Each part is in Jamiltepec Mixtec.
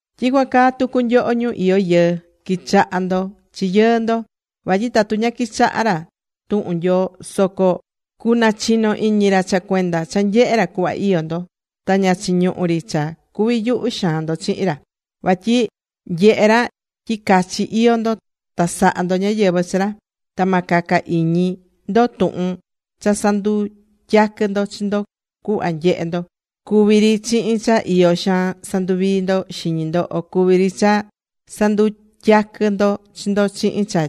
Tyicuan caa tucu nyoho, ñu iyó yɨɨ. Qui̱chaha ndo chi yɨɨ ndo. Vatyi tatu ña quichahá ra tuhun Nyoo soco cunachino iñi ra cha cuenda cha nyehé ra cuhva iyó ndo. Ta ña chiñuhú ri cha cuvi yuhu xaan ndo chihin ra. Vatyi nyehé ra tyi cachi iyó ndo ta sahá ndo ñáyɨvɨ chi ra. Ta ma caca iñi ndo tuhun cha sandutyaquɨ ndo chi ndo cuhva nyehé ndo, cuví ri chihin cha iyo xaan sanduvií ndo xiñi ndo, o cuví ri cha sandutyaquɨ ndo chi ndo chihin cha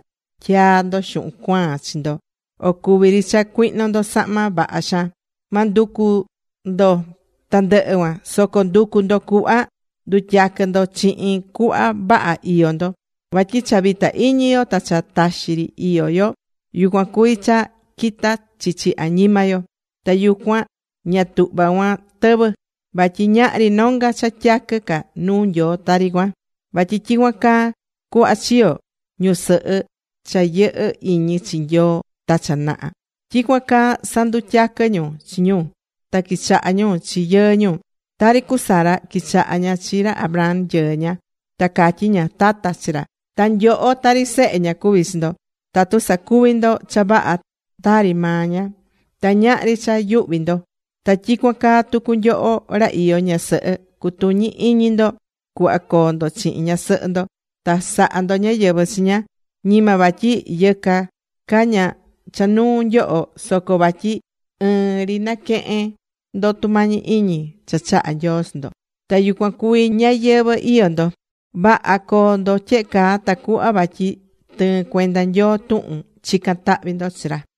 tyaa ndo xuhun cuaan chi ndo, o cuvi ri cha cuihno ndo sahma vaha xaan. Ma nducu ndo tandɨhɨ cuan. Soco ndu̱cu ndo cuhva ndutyaquɨ ndo chihin cuhva vaha iyó ndo. Vatyi cha vita iñi yo ta cha taxi ri iyó yo, yucuan cuví cha quitá chichi añima yo. Ta yucuan ña tuhvá cuan tɨvɨ. Vatyi ñahri nonga cha tyaquɨ ca nuu Nyoo tari cuan. Vatyi tyicuan caa cuhva chiyo̱ ñusɨhɨ cha yɨhɨ́ iñi chi Nyoo ta cha naha. Tyicuan caa sandutyaquɨ̱ ñu chi ñu, ta quichaha̱ ñu chi yɨɨ ñu. Tari cu Sara, quichaha̱ ña chi ra Abraham yɨɨ ña. Ta catyí ña: “Tata”, chi ra. Ta nyoho tari sehe ña cuví chi ndo tatu sacuví ndo cha vaha tari maa ña. Ta ñahri cha yuhví ndo. Ta tyicuan caa tucu nyoho ra iyó ñasɨhɨ. Cu̱tuñi iñi ndo cuhva coo ndo chihin ñasɨhɨ ndo. Ta sa̱ha ndo ñáyɨvɨ chi ña, ñima vatyi yɨca ca ña cha nuu nyoho. Soco vatyi ɨɨn ri naquehe̱n ndo tumañi iñi cha chahá Nyoo chi ndo. Ta yucuan cuví ñayɨvɨ̱ iyó ndo. Vaha co̱o ndo tyehe caa, tacuhva vatyi tɨɨn cuenda Nyoo tuhun chicán tahvi ndo chi ra.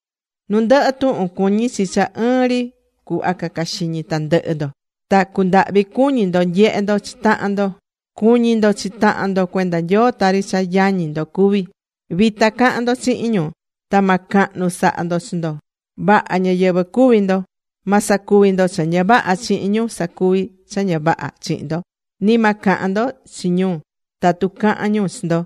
Nu ndɨhɨ tuhun, cuñí chi cha ɨɨn ri cuhva caca xiñi tandɨhɨ ndo. Ta cu̱ndahvi cuñi ndo nyehe ndo chi tahan ndo. Cu̱ñi ndo chi tahan ndo cuenda Nyoo tari cha yañi ndo cuví. Vita ca̱han ndo chihin ñu. Ta ma cahnu saha ndo chi ndo. Vaha ñáyɨvɨ cu̱vi ndo. Ma sacuvi ndo cha ña vaha chihin ñu sacuví cha ña vaha chihin ndo. Ni ma cahan ndo chi ñu tatu cahán ñu chi ndo.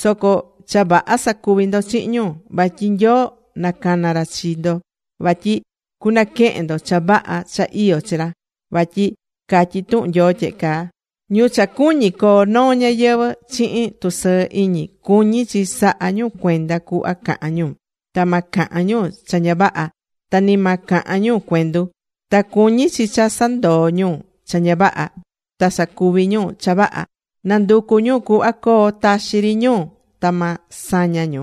Soco cha vaha sa̱cuvi ndo chihin ñu. Vatyi Nyoo nacana̱ ra chi ndo vatyi cunaquehen ndo cha vaha cha iyó chi ra. Vatyi catyí tuhun Nyoo tyehe caa: Ñu cha cuñí coo noo ñayɨvɨ̱ chihin tusɨɨ iñi, cuñí chi saha ñu cuenda cuhva cahán ñu. Ta ma cahan ñu cha ña vaha, ta ni ma cahan ñu cuendu. Ta cuñí chi cha sandoo ñu cha ña vaha ta sacuvi ñu cha vaha. Na̱nducu ñu cuhva coo taxi ri ñu. Ta ma saña ñu.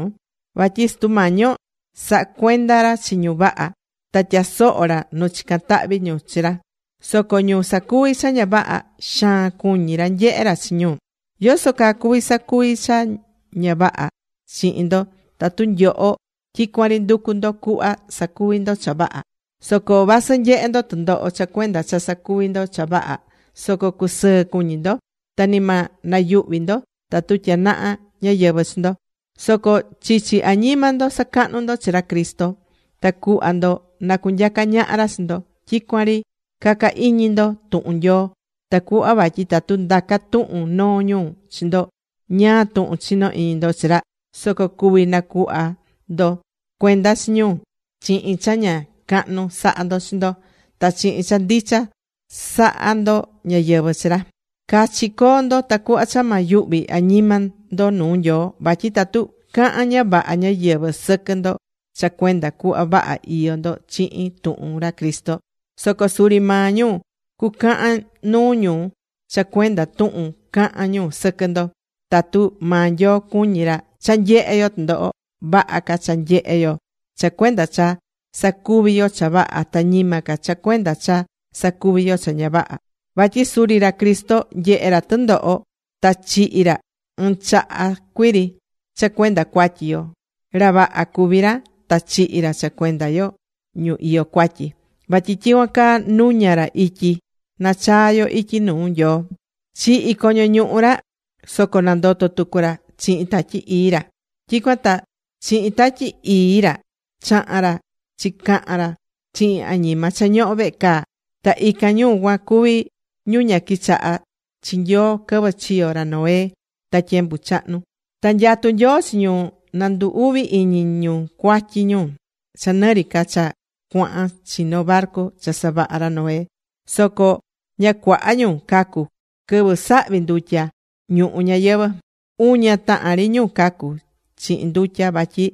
Vatyi Sutu Mañi yo sahá cuenda ra chi ñu vaha. Ta tyasohó ra nu chicán tahvi ñu chi ra. Soco ñu sacuví cha ña vaha, xaan cuñí ra nyehé ra chi ñu. ¿Yóó cha cuví sacuvi cha ña vaha chihin ndo tatu nyoho tyicuan ri nducú ndo cuhva sacuvi ndo cha vaha? Soco vasɨ nyehé ndo tɨndoho cha cuenda cha sacuví ndo cha vaha, soco cucusɨɨ cuñi ndo. Ta ni ma nayuhvi ndo tatu tyanaha ñáyɨvɨ chi ndo. Soco chichi añima ndo sa̱cahnu ndo chi ra Cristo ta cuhva ndo na cunyaca ñaha ra chi ndo. Tyicuan ri ca̱ca iñi ndo tuhun Nyoo tacuhva vatyi tatu ndaca tuhun noo ñu chi ndo ñáá tuhun chinó iñi ndo chi ra, soco cuvi nacuhva ndo cuenda chi ñu chihin cha ña cahnu saha ndo chi ndo ta chihin cha ndicha sahá ndo ñáyɨvɨ chi ra. Cachi co̱o ndo tacuhva cha ma yuhvi añima ndo nuu Nyoo, vatyi tatu cahán ña vaha ñáyɨvɨ sɨquɨ ndo cha cuenda cuhva vaha iyó ndo chihin tuhun ra Cristo, soco suri maa ñu cucahan nuu ñu cha cuenda tuhun caha̱n ñu sɨquɨ ndo. Tatu maa Nyoo cuñí ra cha nyehe yo tɨndoho, vaha ca cha nyehé yo cha cuenda cha sacuví yo cha vaha ta ñima ca cha cuenda cha sacuví yo cha ña vaha. Vatyi suri ra Cristo nyehe̱ ra tɨndoho ta chihi̱ ra ɨɨn chaha cuiri cha cuenda cuatyi yo. Ra vaha cuví ra ta chihi̱ ra cha cuenda yo ñu iyó cuatyi. Vatyi tyicuan caa nuña̱ ra ityi nachaa yo ityi nuu Nyoo. Chihi̱ coño ñuhu ra, soco nandoto̱ tucu ra chihin Tatyi Ii ra. Tyicuan ta chihin Tatyi Ii ra chaha̱n ra chicahan ra chihin añima cha ñohó vehe caa. Ta ican ñu cuan cuví ñu ña quichaha̱ chi Nyoo quɨvɨ chiyo̱ ra Noé ta tyembu chahnu. Ta nyatú Nyoo chi ñu nandu uvi iñi ñu cuatyi ñu cha nɨ ri ca cha cuahan chino barcu cha savaha̱ ra Noé. Soco ña cuaha ñu cacu̱ quɨvɨ sahvi̱ ndutya ñuhu ñayɨvɨ̱. Uña tahan ri ñu cacu̱ chihin ndutya vatyi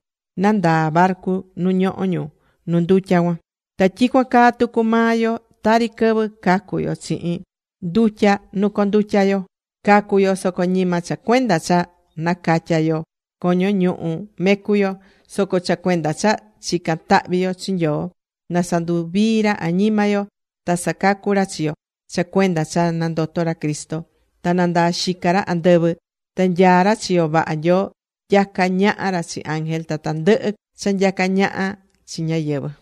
nandaa̱ barcu nu ñohó ñu nu ndutya cuan. Ta tyicuan caa tucu maa yo tari quɨvɨ cacu̱ yo chihin ndutya nu condutya̱ yo. Cacu̱ yo soco ñima cha cuenda cha nacatya̱ yo coño ñuhu mecu yo. Soco cha cuenda cha chicán tahvi yo chi Nyoo na sanduvii ra añima yo ta sacacu ra chi yo cha cuenda cha nandoto̱ ra Cristo. Ta nandaa xica ra andɨvɨ, ta nyaá ra chiyo vaha Nyoo. Nyacá ñaha ra chi ángel ta tandɨhɨ cha nyacá ñaha chi ñáyɨvɨ.